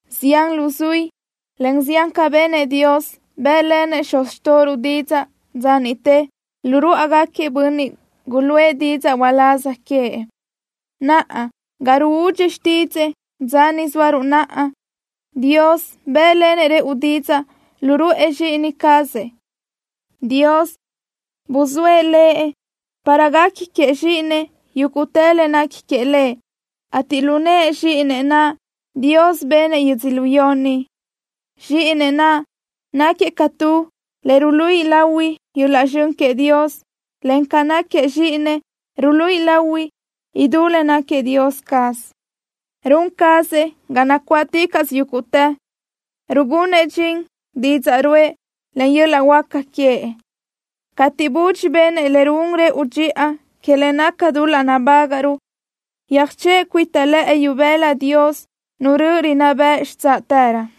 Zián luzuí, en zián ca benëʼ Dios, bë́ʼlenëʼ xuz xtóʼoruʼ didzaʼ dza niʼte lu ruáʼagaquiëʼ bönniʼ guluʼë didzaʼ uláz queëʼ. Naʼa, ga ruúdxi xtídzëʼë, dza ni zóaruʼ naʼa, Dios bë́ʼlenëʼ rëʼu didzaʼ lu ruʼë Zxíʼini cazëʼ. Dios buzóëʼ Lëʼ para guequi queëʼ Zxíʼinëʼ yúguʼtë le nequi queëʼ Lëʼ, ateʼ lu nëʼë Zxíʼinëʼ naʼ, Dios benëʼ yödzölió ni. Zxíʼinëʼ naʼ náquiëʼ ca tu le ruluíʼi lahui yöl-laʼ zxön queëʼ Dios, en ca náquiëʼ Zxíʼinëʼ ruluíʼi lahui idú le náquiëʼ Dios caz. Run cazëʼ ga nacuáʼticaʼsö yúguʼtë, rugunëʼ dxin didzaʼ ruʼë, en yöl-laʼ huáca queëʼ. Cateʼ budxi benëʼ le ruún rëʼu dxiʼa que le naca dul-laʼ nabágaʼruʼ, yöjchöʼë cuita lëʼë ibëla Dios, Nu röʼö rinná bëʼ xitsáʼtërö.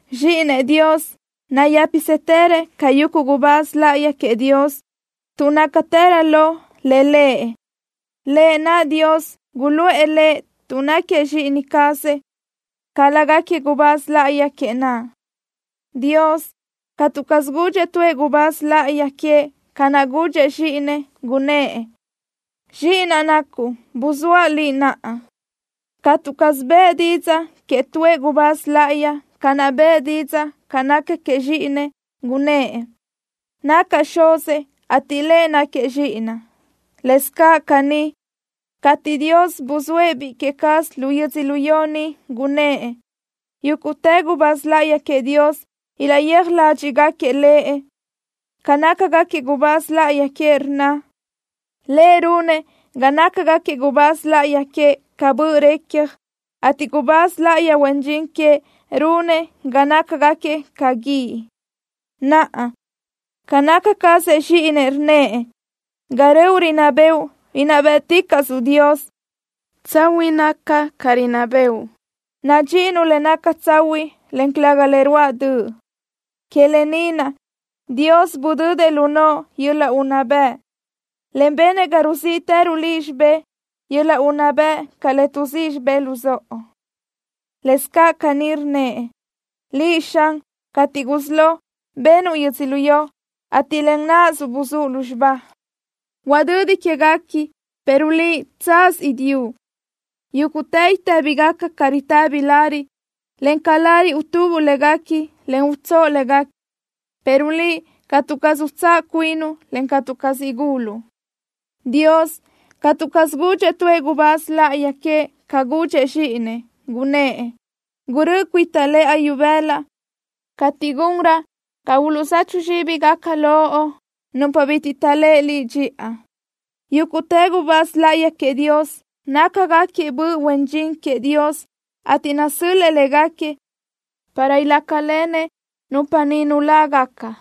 Zxíʼinëʼ Dios nayë́pisëtërëʼ ca yuguʼ gubáz láʼayi queëʼ Dios, tuʼ nácatërö lo le lëʼ, lë naʼ Dios guluʼë Lëʼ tuʼ náquiëʼ Zxíʼini cazëʼ, ca lágaquiëʼ gubáz láʼayi queëʼ naʼ. Dios catu caz gudxëʼ tuëʼ gubáz láʼayi queëʼ ca naʼ gudxëʼ Zxíʼinëʼ. Gunnë́ʼ: Zxíʼinaʼ nacuʼ. Buzóaʼ Liʼ naʼa. Catu caz bëʼë didzaʼ queëʼ tuëʼ gubáz láʼayi ca naʼ bëʼë didzaʼ ca naca queëʼ Zxíʼinëʼ. Gunnë́ʼ: Nacaʼ Xuzëʼ, ateʼ Lëʼ náquiëʼ Zxíʼinaʼ. Lëscaʼ caní, cateʼ Dios buzóëʼ Biʼi que cazëʼ lu yödzölió ni, gunnë́ʼ: Yúguʼtë gubáz láʼayi queëʼ Dios ilaʼyéaj ládxiʼgaquiëʼ Lëʼ. Ca nácagaquiëʼ gubáz láʼayi queëʼ, rnna: Lëʼ runëʼ ga nácagaquiëʼ gubáz láʼayi queëʼ ca böʼ recja, ateʼ gubáz láʼayi huen dxin queëʼ, runëʼ ga nácagaquiëʼ ca guíʼ. Naʼa, ca naca cazëʼ Zxíʼinëʼ, rnnëʼ: Ga röʼu rinná bëʼu, inná bë́ʼticaʼsuʼ, Dios. Tsahuiʼ naca ca rinná bëʼu. Nadxíʼinuʼ le naca tsahuiʼ, en calëga le ruáʼ döʼ. Que lë ni naʼ Dios budödëʼ lu noʼo yöl-laʼ unná bëʼ, en benëʼ ga ruzíʼitëruʼ Liʼ xibé yöl-laʼ unná bëʼ ca le tuʼzíʼi xibé luzóʼo. Lëscaʼ caní rnnëʼ: Liʼ, Xan, cateʼ gusí lo, benuʼ yödzölió, ateʼ len náʼasuʼ buzúʼ lúzxiba. Huadödi quéguequi, pero Liʼ, tsaz idíʼu. Yúguʼtë itë́bigaca ca ritëbi lariʼ, en ca lariʼ utubuʼ léguequi, en utsóʼo léguequi, pero Liʼ, catu caz utsáʼ cuinuʼ en catu caz iguluʼ. Dios catu caz gudxëʼ tuëʼ gubáz láʼayi queëʼ ca gudxëʼ Zxíʼinëʼ, gunnë́ʼ: Gurö́ʼö cuita lëʼa ibëla cateʼ gunraʼ ga uluʼzechu zxíbigaca loʼ nupa bitiʼ taʼléʼe Liʼ dxiʼa. Yúguʼtë gubáz láʼayi queëʼ Dios nácagaquiëʼ böʼ huen dxin queëʼ Dios, ateʼ nasö́l-lëʼë légaquiëʼ para ilácalenëʼ nupa ni nulágaca.